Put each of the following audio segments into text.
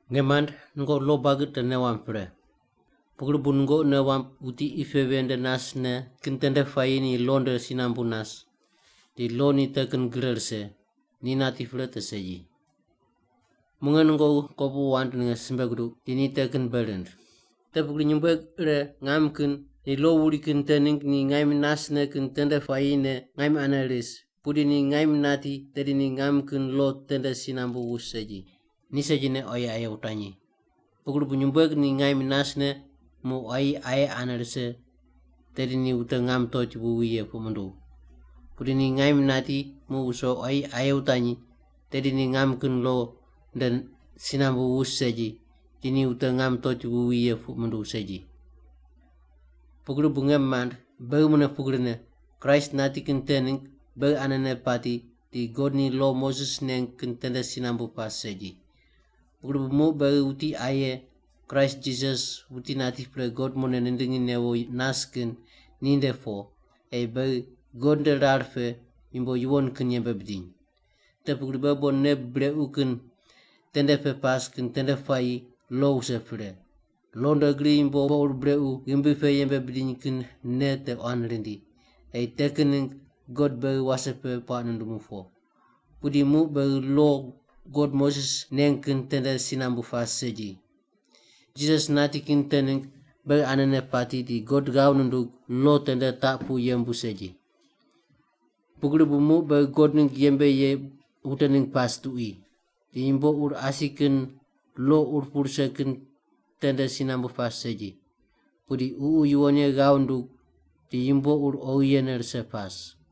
Nge mand, nungoqi lo buagi te nei wamb pre. Pugri bu nungoqi nei wamb wuti qi pe ven nde nasne kin tende puayi ni lo nde si nambu nas, di lo ni te kin gre rise, ni nati pre te segi. Muq nge nungoqi kopuqu wand ninge simbe guduq di ni te kin bei rind. Te pugri nyumbueg ire ngam kin ni lo wuri kin te ningg ni ngaim nasne kin tende puayine ngaim ane ris, pudi ni ngaim nati tedi ni ngam kin lo tende si nambu wus segi. Ni segine quayi aye wutanyi. Pugri bu nyumbueg ni ngaim nasne muq quayi aye ane rise, tedi ni wute ngam toti wuwi ye puq munduw. Pudi ni ngaim nati muq wuso quayi aye wutanyi, tedi ni ngam kin lo nde si nambu wus segi, di ni wute ngam toti wuwi ye puq munduw segi. Pugri bu, nge mand, beghi mune pugrine, Kraist nati kin te ningg beghi anene pati di God ni lo Moses neng kin tende si nambu pas segi. Pugri bu muq beghi wuti aye, Kraist Jisas wuti nati pre God mune nindingi newo nas kin, ni nde po, ei beghi God nde rar pe yumbo yuwon kin yembe bidiny. Te pugri beghi bon nei brequ kin tende pe pas kin tende puayi lo wuse pre. Lo nde gri yumbo ur brequ ghimbi pe yembe bidiny kin nei te quan rindi, ei te kin ningg God beghi wase pe puaq nundumu po. Pudi muq beghi lo God Moses neng kin tende si nambu pas segi. Jisas nati kin te ningg beghi anene pati di God ghav nundug lo te nde taq pu yembu segi. Pugri bu muq beghi God ningg yembe ye wute ningg pas tuqui. Di yumbo ur asi kin, lo ur pu rise kin tende si nambu pas segi. Pudi Ququ Yuwon Ye ghav nundug di yumbo ur oghi yene rise pas.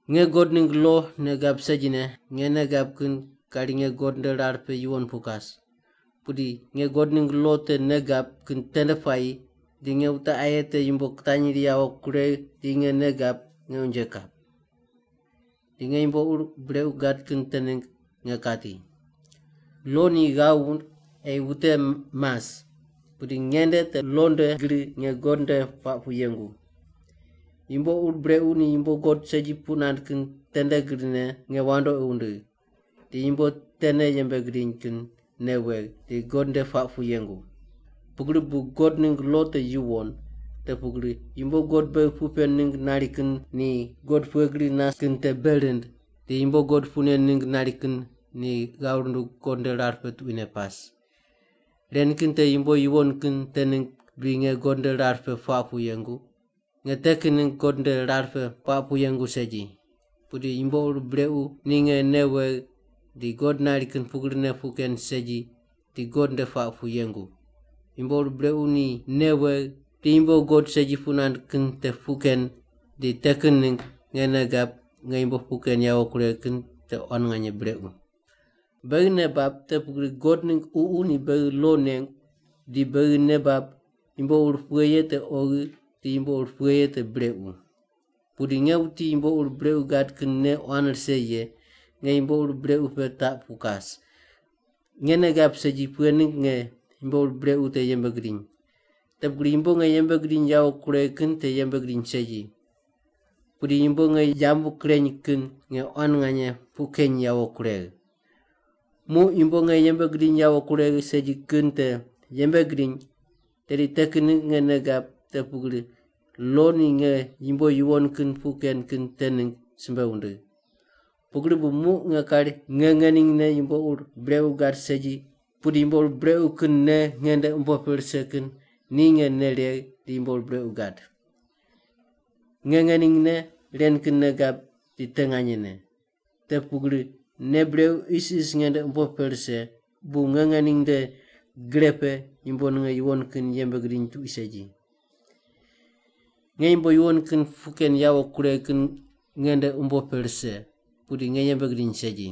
Nge God ningg lo nei gab segine, nge nei gab kin kari nge God nde rar pe yuwon pu kas. Pudi nge God ningg lo te nei gab kin tende puayi di nge wute aye te yumbo kitanyri yawo kuregh di nge nei gab nge unje kap. Di nge yumbo ur brequ gad kin te ningg nge kati. Lo ni ghav wund ei wute mas, pudi nge nde te lo nde gri nge God nde puaq pu yengu. Yumbo ur brequ ni yumbo God segi puq nand kin tende grine nge wandoqi wundigh di yumbo tene yembe gidiny kin nei wegh, di God nde puaq pu yengu. Pugri bu God ningg lo te yuwon, te pugri yumbo God beghi puq pen ningg nari kin ni God pughe gri nas kin te bei rind, di yumbo God puq pen ningg nari kin ni ghav rundug God nde rar pe tuquine pas. Ren kin te yumbo yuwon kin te ningg bri nge God nde rar pe puaq pu yengu? Nge te kin ningg God nde rar pe puaq pu yengu segi! Pudi yumbo ur brequ ni nge nei wegh di God nari kin pugrine puq ken segi di God nde puaq pu yengu. Yumbo ur brequ ni nei wegh di yumbo God segi puq nand kin te puq ken di te kin ningg nge nei gab nge yumbo puq ken yawo kuregh kin te quan nganye brequ. Beghi nei bab te pugri God ningg Ququ ni beghi lo nengu di beghi nei bab yumbo ur pughe ye te oghi di yumbo ur pughe ye te brequ. Pudi nge wuti yumbo ur brequ gad kin nei quan rise ye, nge yumbo ur brequ pe taq pu kas. Nge nei gab segi pughe ningg nge yumbo ur brequ te yembe gidiny. Te pugri yumbo nge yembe gidiny yawo kuregh kin te yembe gidiny segi, pudi yumbo nge yambu kureny kin nge quan nganye puq keny yawo kuregh. Muq yumbo nge yembe gidiny yawo kuregh segi kin te yembe gidiny tedi te kin ningg nge nei gab te pugri lo ni nge yumbo yuwon kin puq ken kin te ningg simbe wundigh. Pugri bu muq nge kari nge ngeningne yumbo ur brequ gad segi pudi yumbo ur brequ kin nei nge nde umbo pe rise kin ni nge nei regh di yumbo ur brequ gad. Nge ngeningne ren kin nei gab di te nganyene: Te pugri nei brequ isis nge nde umbo pe rise, bu nge ngening nde gre pe yumbo ninge yuwon kin yembe gidiny tuqui segi. Nge yumbo yuwon kin puq ken yawo kuregh kin nge nde umbo pe rise, pudi nge yembe gidiny segi.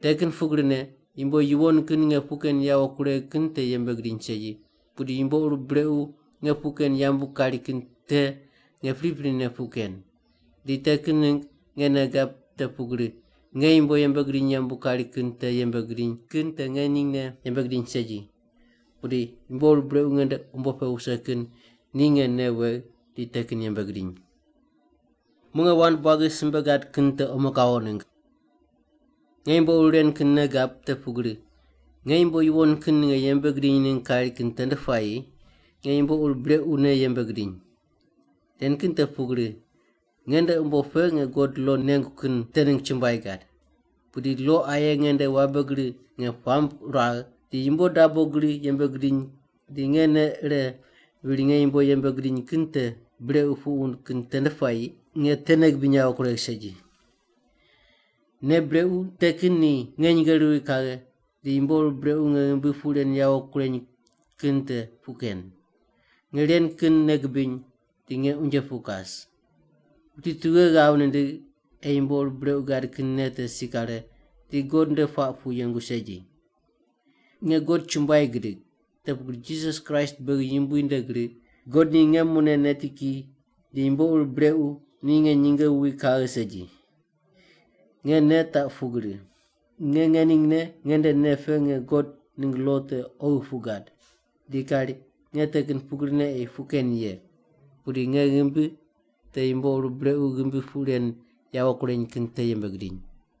Te kin pugrine, yumbo yuwon kin nge puq ken yawo kuregh kin te yembe gidiny segi, pudi yumbo ur brequ nge puq ken yambu kari kin te nge priprine puq ken. Di te kin ningg nge nei gab te pugri, nge yumbo yembe gidiny yambu kari kin te yembe gidiny kin te nge ngeningne yembe gidiny segi, pudi yumbo ur brequ nge nde umbo pe wuse kin ni nge nei wegh di te kin yembe gidiny. Muq nge wand buagi simbe gad kin te omo kawo ningg. Nge yumbo ur ren kin nei gab te pugri, nge yumbo yuwon kin ninge yembe gidiny ningg kari kin tende puayi nge yumbo ur brequne yembe gidiny. Ren kin te pugri, nge nde umbo pe nge God lo nengu kin te ningg chumbuai gad. Pudi lo aye nge nde wabe gri nge puamb ruagh di yumbo dabo gri yembe gidiny di nge nei ire viri nge yumbo yembe gidiny kin te brequ puq wund kin tende puayi nge te nei gibiny yawo kuregh segi. Nei brequ te kin ni nge nyinge ruwi kaghe di yumbo ur brequ nge ghimbi puq ren yawo kureny kin te puq ken. Nge ren kin nei gibiny di nge unje pu kas! Wuti tughe ghav nindigh ei yumbo ur brequ gad kin nei te si kare di God nde puaq pu yengu segi? Nge God chumbuai gidig, te pugri Jisas Kraist beghi Yumbui nde gri God ni nge mune neti ki di yumbo ur brequ ni nge nyinge wuwi kaghe segi. Nge nei taq pugri: nge ngeningne nge nde nei pe nge God ningg lo te oghi puq gad, di kari nge te kin pugrine ei puq ken ye. Pudi nge ghimbi te yumbo ur brequ ghimbi puq ren yawo kureny kin te yembe gidiny.